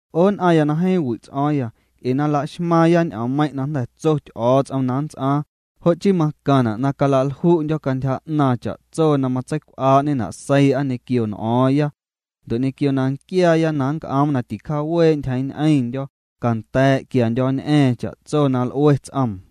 'O nn'aⁿya na jeeⁿ wi' ts'o̱o̱ⁿya, nc'e na la'xmaaⁿya ñ'oommeiⁿ' na jnda̱ tso Ty'o̱o̱ts'om na nnts'aaⁿ, jo' chii macaⁿna' na cala'lju'ndyo̱ cantyja 'naaⁿ cha'tso na matseicw'aa'ñena' seii'a ñequio n'o̱o̱ⁿya. Ndo' ñequio na nquiaaya na nc'oom na ticjawee' ntyjeeⁿ ñ'eⁿndyo̱, canda̱a̱' quiandyo̱ñ'a̱a̱ⁿ cha'tso na l'ue ts'oom.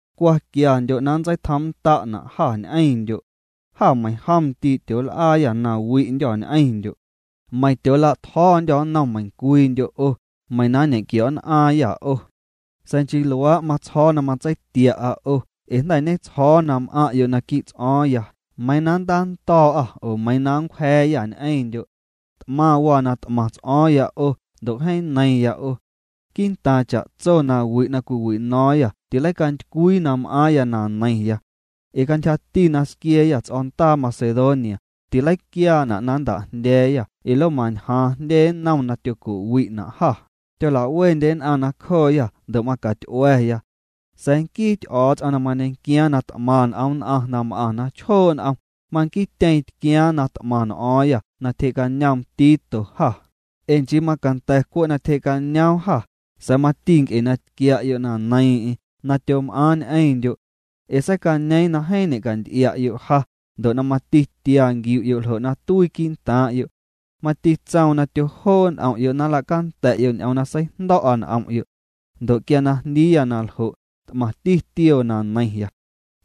Cwa quiandyo' na nntseitjoom'nnda'na' jâ ñ'eⁿndyo'. Jâ meiⁿjom ndii' tyool'aayâ nawi'ndyô̱ ñ'eⁿndyo'. Meiⁿ tyoola'tjo̱o̱ndyô̱ nnom meiⁿcwiindyo' 'o, meiⁿ na nñe'nquio̱'nn'aaⁿyâ 'o. Sa̱a̱ nchii luaa' matsjo̱o̱ na matseitia'a 'o ee jnda̱ ñetsjo̱o̱ na m'aⁿ'yo' naquii' ts'o̱o̱ⁿya meiiⁿ na nntando̱o̱'â oo meiiⁿ na nncwja̱a̱yâ ñ'eⁿndyo'. T'maⁿ waa na t'maⁿ ts'o̱o̱ⁿya 'o ndo' jeeⁿ neiⁿya 'o. Quii'ntaaⁿ cha'tso nawi' na cwiwino̱o̱ⁿyâ tileicantycwii na m'aaⁿya na neiⁿya. Ee cantyjati na squia̱a̱yâ ts'o̱o̱ndaa Macedonia, tileiquiaana' na nnta'jndya̱a̱yâ ee lomañjaaⁿ jndye nnom na tyoco'wi'na' jâ, tyolawendye nn'aⁿ nacjooyâ ndo' macaty'ua̱ya. Sa̱a̱ nquii Ty'o̱o̱ts'om na mañequiaaⁿ na t'maⁿ n'om nn'aⁿ na m'aⁿ na chjoo' n'om, manquiityeeⁿ tquiaaⁿ na t'maⁿ n'o̱o̱ⁿyâ na tyjee'cañoom Tito jâ, ee nchii macanda̱ cwe' na tyje'cañoom jâ, sa̱a̱ mati nc'e na tquia'yo' na neiiⁿ'eⁿ na tyom'aaⁿ ñ'eⁿndyo'. Ee seicañeeⁿ na jeeⁿ ñe'canty'ia'yo' ja, ndo' na tia nquiu'yo' ljo' na tuii quii' ntaaⁿ'yo'. Mati tsoom na tyojoo' n'om'yo' na nla'canda̱'yo' ñ'oom na seijndo̱'a n'om'yo'. Ndo' quia na jndiiya na ljo', t'maⁿti tioo na neiⁿya.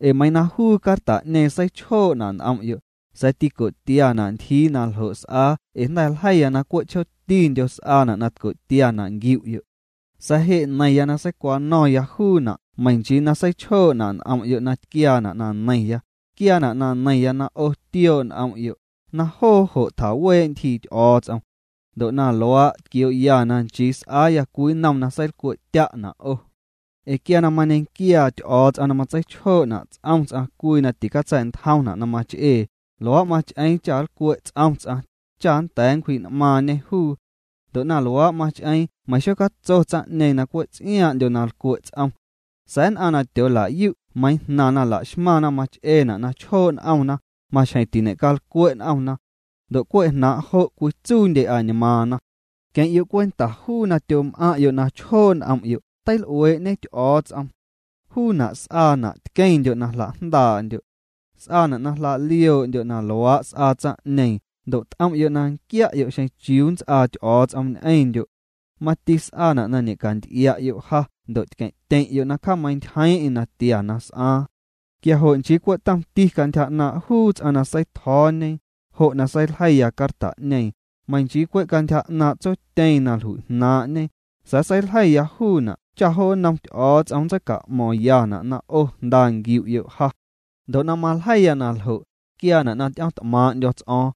Ee meiiⁿ na juu carta'ñeeⁿ seichjoo'na' n'om'yo', sa̱a̱ tico'tiana' ntyjii na ljo' s'aa ee jnda̱ ljeiya na cwe' chjootindyo s'aana' na tco'tiana' nquiu'yo', sa̱a̱ je' neiⁿya na seicwano̱ⁿya juuna' meiⁿ nchii na seichjoo'na' n'om'yo' na tquiaana' na neiⁿya, tquiaana' na neiⁿya na 'o tioo' n'om'yo', na jo' jo' tjawee' ntyjii Ty'o̱o̱ts'om. Ndo' na luaa' tquioo'ya na nchii s'aaya cwii nnom na seilcwe'tya'na' 'o. Ee quia na mañequiaa Ty'o̱o̱ts'om na matseichjoo'na' ts'om ts'aⁿ cwii na ticatsa̱'ntjomna' na mach'ee, luaa' mach'eeⁿ cha nlcwe' ts'om ts'aⁿ, cha nnda̱a̱ nncwji'n'maaⁿñê juu. Ndo' na luaa' mach'eeⁿ meiⁿ xocatso tsaⁿ'ñeeⁿ na cwe' ts'iaaⁿ'ndyo na lcwe' ts'om. Sa̱a̱ nn'aⁿ na tyoola'yu' meiiⁿ jnaⁿ na laxmaⁿna mach'eena' na chjoo' n'omna, maxjeⁿ tiñe'calcwe' n'omna. Ndo' cwe' jnaaⁿ' jo' cwitsuundye añmaaⁿna. Queⁿ'yo' cwenta juu na tyom'aⁿ'yo' na chjoo' n'om'yo' teil'uee'ñe Ty'o̱o̱ts'om. Juuna' s'aana' na tqueⁿndyo' na jla'jndaa'ndyo'. S'aana' na jla'lioo'ndyo' na luaa' s'aa tsaⁿ'ñeeⁿ ndo' t'om'yo' na nquia'yo' xeⁿ chiuu nnts'aa Ty'o̱o̱ts'om ñ'eⁿndyo'. Mati s'aana' na ñe'canty'ia'yo' ja ndo' tqueⁿ'tyeⁿ'yo' na cjameintyjeeⁿ'eⁿ natia na s'aaⁿ. Quia jo' nchii cwe' tomti cantyja 'naaⁿ' juu ts'aⁿ na seitjo̱o̱ñe, jo' na seiljeiya carta'ñeeⁿ, meiiⁿ nchii cwe' cantyja 'naaⁿ' tsotyeeⁿ na jlui'jnaaⁿ'ñe, sa̱a̱ seiljeiya juuna' cha' jo nnom Ty'o̱o̱ts'om nntseica'mo̱ⁿyana' na 'o jnda nquiu'yo' ja. Ndo' na maljeiya na ljo', tquiaana' na ty'o̱ⁿt'maaⁿ'ndyo̱ ts'o̱o̱ⁿ.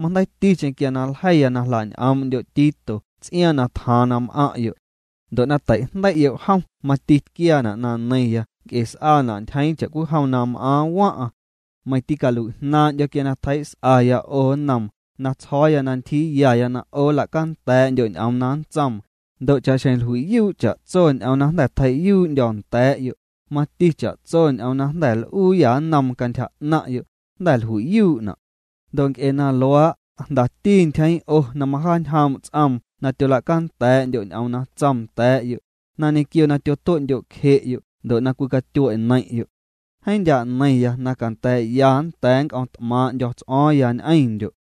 Majndeiiticheⁿ quia na ljeiya na jla'ñ'oom'ndyo' Tito ts'iaaⁿ na tjaaⁿ na m'aⁿ'yo'. Ndo' na teijndei'yo' jom mati tquiaana' na neiⁿya nc'e s'aana' ntyjeeⁿ cha'cwijom na m'aaⁿ waⁿ'aⁿ. Meiⁿ tîcalui'jnaaⁿ'ndyo̱ quia na tjei's'aya 'o nnoom, na tsjo̱o̱ya na ntyjiiyaya na 'o nla'canda̱a̱'ndyo' ñ'oom na nntsoom, ndo' cha'xjeⁿ jlui'yuu' cha'tso ñ'oom na jnda̱ tjei'yuu'ndyo̱ nda̱a̱'yo', mati cha'tso ñ'oom na jnda̱ l'uuyâ nnoom cantyja 'naⁿ'yo', jnda̱ jlui'yuu'na'. Ndo' nc'e na luaa', jndati ntyjeeⁿ 'o na majaañjoom' ts'oom na tyola'canda̱a̱'ndyo' ñ'oom na tsoom nda̱a̱'yo', na ñequio na tyotue'ndyo'cje'yo' ndo' na cwicatyue' neiⁿ'yo'. Jeeⁿ ndyaa' neiⁿya na canda̱a̱'ya nnda̱a̱ nnc'o̱ⁿt'maaⁿ'ndyo̱ ts'o̱o̱ⁿya ñ'eⁿndyo'.